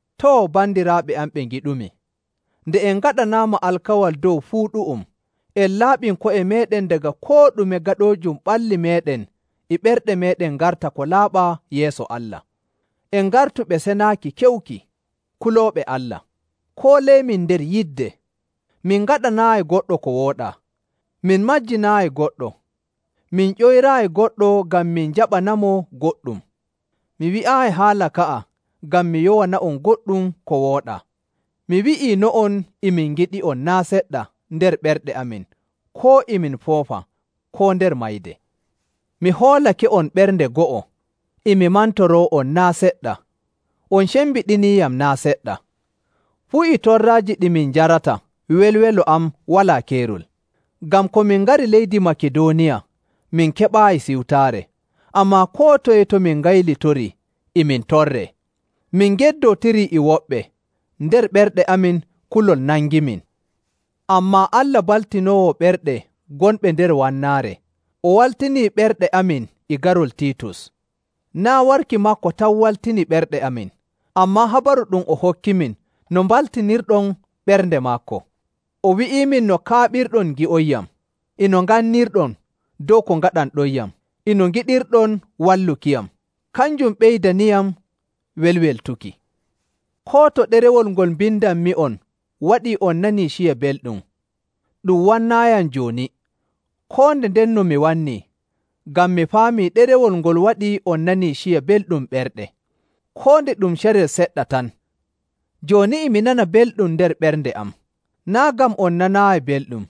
Too, bandiraaɓe am ɓe ngiɗumi, nde en ngaɗanaama alkawal dow fuu ɗu'um, en laaɓin ko'e meeɗen daga koo ɗume gaɗoojum ɓalli meeɗen e ɓerɗe meeɗen ngarta ko laaɓaa yeeso Allah. En ngartu ɓe senaaki keewuki, kulooɓe Allah. Kooleemin nder yidde. Min ngaɗanaayi goɗɗo ko wooɗaa, min majjinaayi goɗɗo, min ƴoyraayi goɗɗo ngam min njaɓanamo goɗɗum. Mi wi'aayi haala ka'a ngam mi yowana'on goɗɗum ko wooɗaa. Mi wi'iino'on e min ngiɗi'on naa' seɗɗa nder ɓerɗe amin koo e min foofa koo nder mayde. Mi hoolake'on ɓernde go'o, e mi mantoroo'on naa' seɗɗa, on cembiɗiniiyam naa' seɗɗa. Fuu e torraaji ɗi min njarata, welwelo am walaa keerol. Ngam ko min ngari leydi Makidooniya, min keɓaayi siwtaare, ammaa koo toye to min ngaylitorii e min torree. Min ngeddootirii e woɓɓe, nder ɓerɗe amin kulol nangimin. Ammaa Allah baltinoowo ɓerɗe gonɓe nder wannaare, o waltini ɓerɗe amin e garol Tiitus. Naa' warki maako tan waltini ɓerɗe amin, ammaa habaru ɗum o hokkimin no mbaltinirɗon ɓernde maako. O wi'iimin no kaaɓirɗon ngi'onyam, e no ngannirɗon dow ko ngaɗanɗonyam, e no ngiɗirɗon wallukiyam. Kanjum ɓeydaniyam welweltuki. Koo to ɗerewol ngol mbindanmi'on waɗii on nanii ciya belɗum, ɗum wannaayiyam jooni, koo nde ndenno mi wannii, ngam mi faamii ɗerewol ngol waɗii on nanii ciya belɗum ɓerɗe, koo nde ɗum carel seɗɗa tan. Jooni e mi nana belɗum nder ɓernde am, naa' ngam on nanaayi belɗum,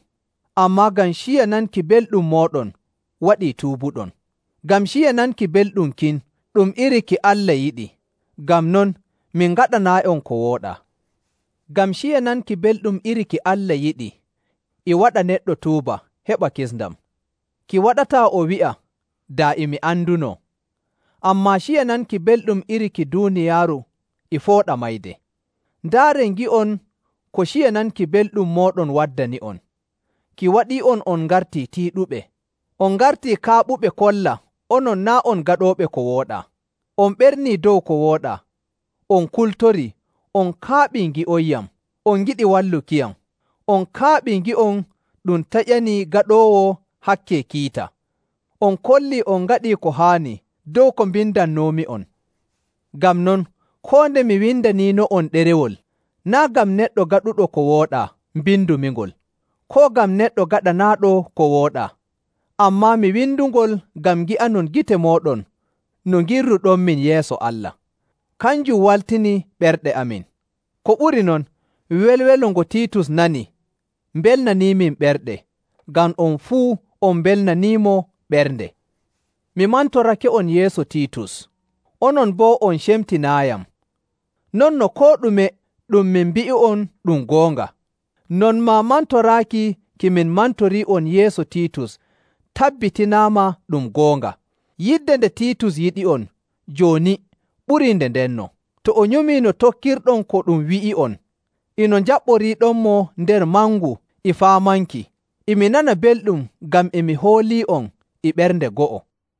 ammaa ngam ciya nanki belɗum mooɗon waɗi tuubuɗon. Ngam ciya nanki belɗum kin ɗum iri ki Allah yiɗi. Ngam non min ngaɗanaayi'on ko wooɗaa. Ngam ciya nanki belɗum iri ki Allah yiɗi e waɗa neɗɗo tuuba heɓa kisndam. Ki waɗataa o wi'a, “Daa e mi andunoo,” ammaa ciya nanki belɗum iri ki duuniyaaru e fooɗa mayde. Ndaaree ngi'on ko ciya nanki belɗum mooɗon waddani'on, ki waɗii'on on ngartii tiiɗuɓe, on ngartii kaaɓuɓe kolla onon naa' on gaɗooɓe ko wooɗaa, on ɓernii dow ko wooɗaa, on kultorii, on kaaɓii ngi'onyam, on ngiɗii wallukiyam, on kaaɓii ngi'on ɗum taƴanii gaɗoowo hakke kiita. On kollii on ngaɗii ko haani dow ko mbindannoomi'on. Ngam non, koo nde mi windaniino'on ɗerewol, naa' ngam neɗɗo gaɗuɗo ko wooɗaa mbindumingol, koo ngam neɗɗo gaɗanaaɗo ko wooɗaa, ammaa mi windungol ngam ngi'anon gite mooɗon no ngirruɗonmin yeeso Allah. Kanjum waltini ɓerɗe amin. Ko ɓuri non, welwelo ngo Tiitus nani mbelnaniimin ɓerɗe, ngam on fuu on mbelnaniimo ɓernde. Mi mantorake'on yeeso Tiitus, onon boo on cemtinaayiyam. Non no koo ɗume ɗum min mbi'i'on ɗum goonga, non maa mantoraaki ki min mantorii'on yeeso Tiitus tabbitinaama ɗum goonga. Yidde nde Tiitus yiɗi'on jooni ɓurii nde ndenno, to o nyumii no tokkirɗon ko ɗum wi'i'on, e no njaɓɓoriiɗonmo nder mangu e faamanki. E mi nana belɗum ngam e mi hoolii'on e ɓernde go'o.